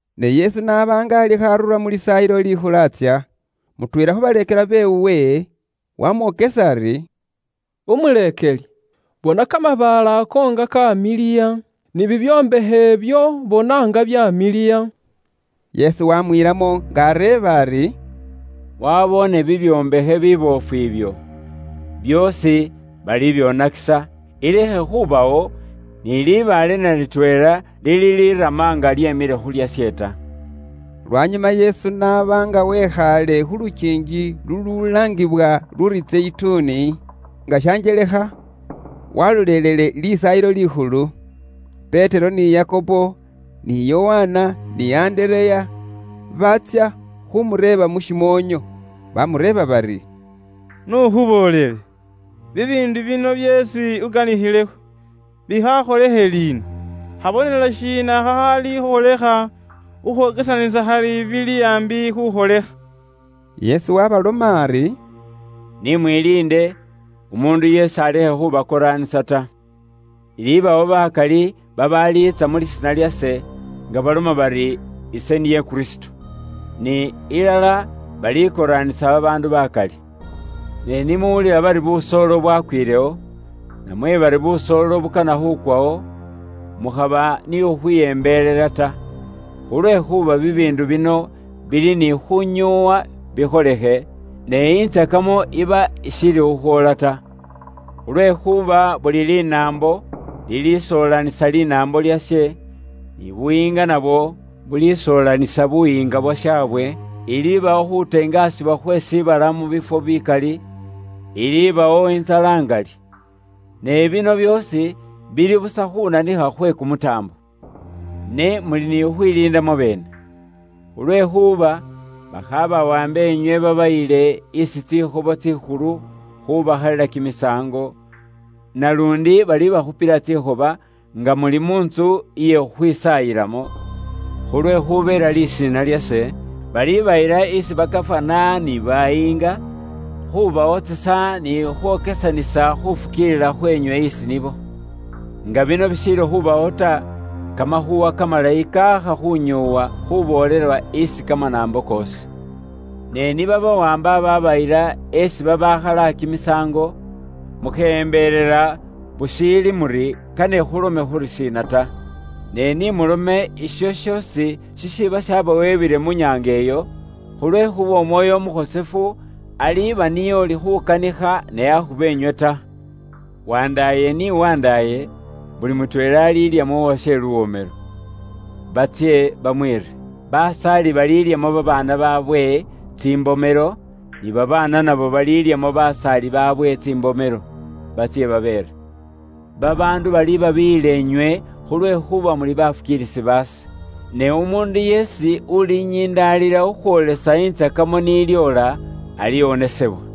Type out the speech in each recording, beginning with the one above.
Ne Yesu n'aba nga alikho arura mu Lisaayilo Likhulu atsya, mutweela khu baleekelwa beewe wamwokesa ari, “Umuleekeli, bona kamabaale ako nga kamiliya, ni bibyombakhe ibyo bona nga byamiliya!” Yesu waamwilamo nga areeba ari, “Waboone bibyombakhe biboofu ibyo? Byoosi balibyoonakisa, ilekhe khubawo ni libaale na litweela lilirama nga lyemile khu lyashe ta.” Lwanyuma Yesu n'aba nga wekhaale khu lukiingi lululaangibwa luri Zeyituni, nga shanjelekha walolelele Lisaayilo Likhulu, Petero ni Yakobo, ni Yokana, ni Andereya, baatsya khuumureeba mu shimoonyo. Baamureeba bari, “N'ukhuboolele, bibiindu bino byeesi ukanikhilekho, bikhakholikhe liina? Khabonelo shiina khakhaalikholikha khukhwokesanisa khali bili aambi khuukholikha?” Yesu waabaloma ari, “Ni mwiliinde, umuundu yeesi alekhe khubakoraanisa ta. Ilibawo bakali babaaliitsa mu lisiina lyase, nga baloma bari, ‘Ise niye Kristo,’ ni ilala balikooranisa babaandu bakali. Ne ni muwulila bari busoolo bwakwilewo, namwe bari busoolo bukana khukwawo, mukhaba ni khukhwiyembelela ta. Khulwekhuuba bibiindu bino bili ni khunyoowa bikholekhe, ne intsakamo iba ishiili khukhwoola ta. Khulwekhuuba buli linaambo lilisoolanisa linaambo lyashe, ni buyiinga nabwo bulisoolanisa buyiinga bwashabwe; ilibawo khuteengasibwa khwe shiibala mu bifwo bikali; ilibawo intsala ingali. Ne bino byoosi bili busa khunanikha khwe kumutaambo. “Ne muli ni khukhwiliinda mwabeene. Khulwekhuuba bakhabawambe inywe babayile isi tsikhobo tsikhulu khubakhalila kimisaango; naluundi balibakhupila tsikhoba nga muli mu ntsu iye khukhwisaayilamo. Khulwekhubeela lisiina lyase, balibayila isi ba gafana ni bayiinga, khubawotsesa ni khukhwokesanisa khufukiilila khwenywe isi nibo. Nga bino bishiili khubawo ta, Kamakhuuwa Kamalayi kaakha khunyoowa khuboolelwa isi kamanaambo koosi. Ne ni babawaamba babayila esi babaakhala kimisaango, mukheyembelela bushiili muri kane khulome khurishiina ta. Ne ni mulome isho shoosi shishiiba shabawebwile mu nyaanga iyo, khulwekhuuba Umwoyo Umukhosefu aliba niye ulikhukanikha, ne akhuba inywe ta. “Wandaaye ni wandaaye, buli mutweela alilyamo uwashe luwomelo, batsye bamwiire. Basaali balilyamo babaana baabwe tsimbomelo, ni babaana nabo balilyamo basaali baabwe tsimbomelo, batsye babeere. Babaandu balibabiiyila inywe khulwekhuuba muli bafukiilisi baase. Ne umuundu yeesi ulinyindalila khukhwoolisa intsakamo ni lyoola, aliwonesebwa.”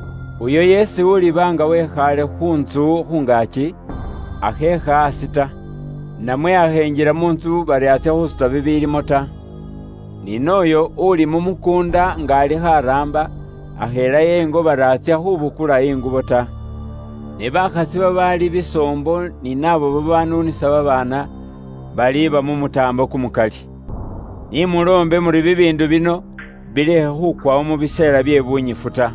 Uyo yeesi uliba nga wekhaale khu ntsu khungaaki, akheekha aasi ta, namwe akhenjila mu ntsu bari atsya khusuta bibilimo ta. Ni nooyo uli mu mukuunda nga alikho araamba, akhelayo ingo bari atsya khubukula ingubo ta. Ne bakhasi babaali bisoombo ni naabo babanuunisa babaana, baliba mu mutaambo kumukali. Ni muloombe muri bibiindu bino bilekhe khukwawo mu biseela bye bunyifu ta.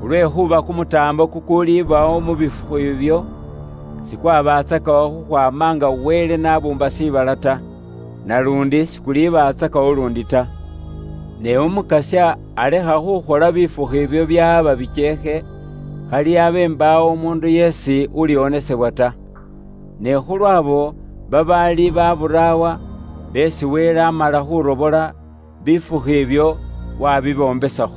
Khulwekhuuba kumutaambo kukulibawo mu bifukhu ibyo, sikwabatsakawo khukhwaama nga Wele n'abuumba shiibala ta. Naluundi sikulibatsakawo luundi ta. Ne Umukasya alekha khukhola bifukhu ibyo byaaba bikyeekhe, khali abe mbaawo umuundu yeesi uliwonesebwa ta. Ne khulwa abo babaali ba buraawa, beesi Wele amala khurobola, bifukhu ibyo wabibombesakho.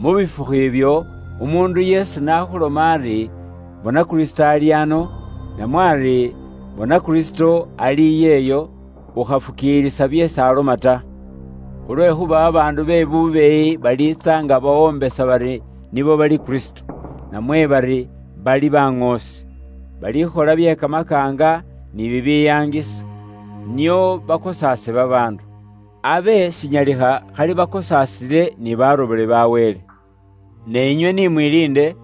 “Mu bifukhu ibyo, umuundu yeesi n'akhuloma iwe ari, ‘Bona Kristo ali ano,’ namwe ali, ‘Bona Kristo ali iyeyo!’ Ukhafukiilisa byeesi aloma ta. Khulwekhuuba ba Kristo be bubeeyi ni baŋoosi be bubeeyi baliwulukha, bakhole bye kamakaanga ni bibiyaangisa, nio bakosaase babaandu. Abe shinyalikha khali bakosaasile ni barobole ba Wele. Ne inywe ni mwiliinde,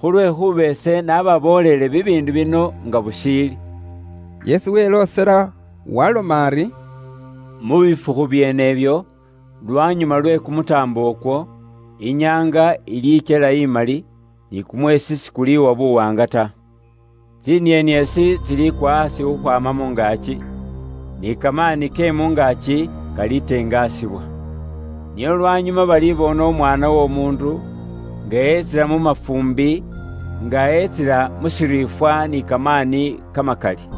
khulwekhuuba ise nababooleele bibiindu bino nga bushiili.” Yesu weloosela waaloma ari, “Mu bifukhu byeene ibyo, lwanyuma lwe kumutaambo ukwo, inyaanga ilikyela imali, ni kumweesi sikuliwa buwaanga ta. Tsinieniesi tsilikwa aasi khukhwaama mu ngaaki, ni kamaani ke mu ngaaki kalitengasibwa. Nio lwanyuma balibona Umwaana w'Omuundu nga etsila mu mafuumbi, nga etsila mu shiriifwa ni kamaani kamakali.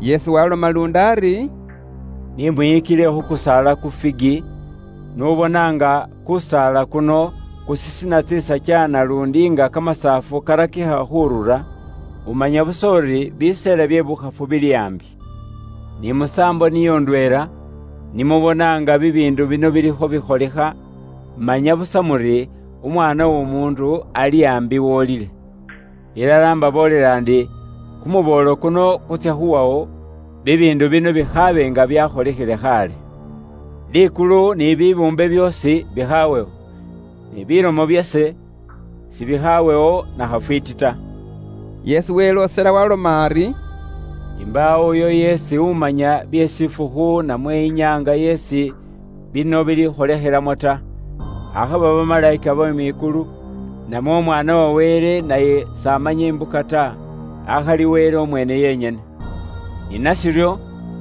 Yesu waloma luundi ari, “Ni mwiyikile khu kusaala ku Figi. N'ubona nga kusaala kuno kusisina tsisakya naluundi nga kamasaafu karakikha khurura, umanya busa uri biseela bye bukhafu bili aambi. Ni musaambo niyo ndweela, ni mubona nga bibiindu bino bilikho bikholikha, manya busa muri Umwaana w'Omuundu ali aambi, wolile khu shilibwa. Ilala imbaboolela ndi, kumuboolo kuno kutsya khuwawo, bibiindu bino bikhaabe nga byakholikhile khaale. Likulu ni shiibala byoosi bikhawewo, ne bilomo byase sibikhawewo na khafwiiti ta.” Yesu weloosela waaloma ari, “Imbaawo uyo yeesi umanya bye shifukhu namwe inyaanga yeesi bino bilikholikhilamo ta. Akhaba bamalayika be mwikulu, namwe Umwaana wa Wele naye s'amanya imbuka ta, akhali Wele umweene yenyene. Ni nashiryo,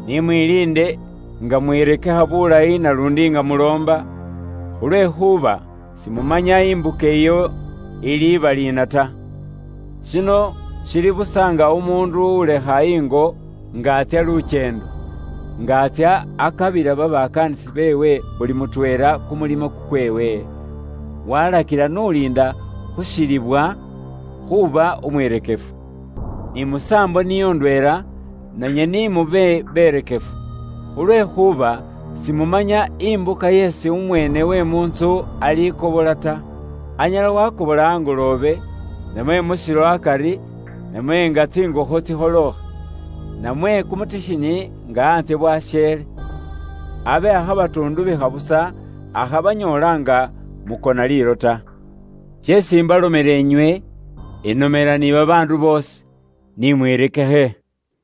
ni mwiliinde nga mwirekekha bulayi naluundi nga muloomba, khulwekhuuba simumanya imbuka iyo iliba liina ta. Shino shili busa nga umuundu ulekha ingo nga atsya lukyeendo. Nga atsya, akabila babakaanisi beewe buli mutweela kumulimo kukweewe, walakila n'uliinda khu shilibwa khuuba umwirekefu. Ni musaambo niyo indweela, nanywe ni mube beerekefu, khulwekhuuba simumanya imbuka isi umweene uwe mu ntsu alikobola ta. Anyala waakobola angoloobe, namwe mu shilo akari, namwe nga tsingokho tsikholookha, namwe kumutikhinyi nga antsye bwasheele. Abe akhabatuundubikha busa, akhabanyoola nga mukona liilo ta. Sheesi imbalomela inywe, inomela ni babaandu boosi: Ni mwirekekhe!”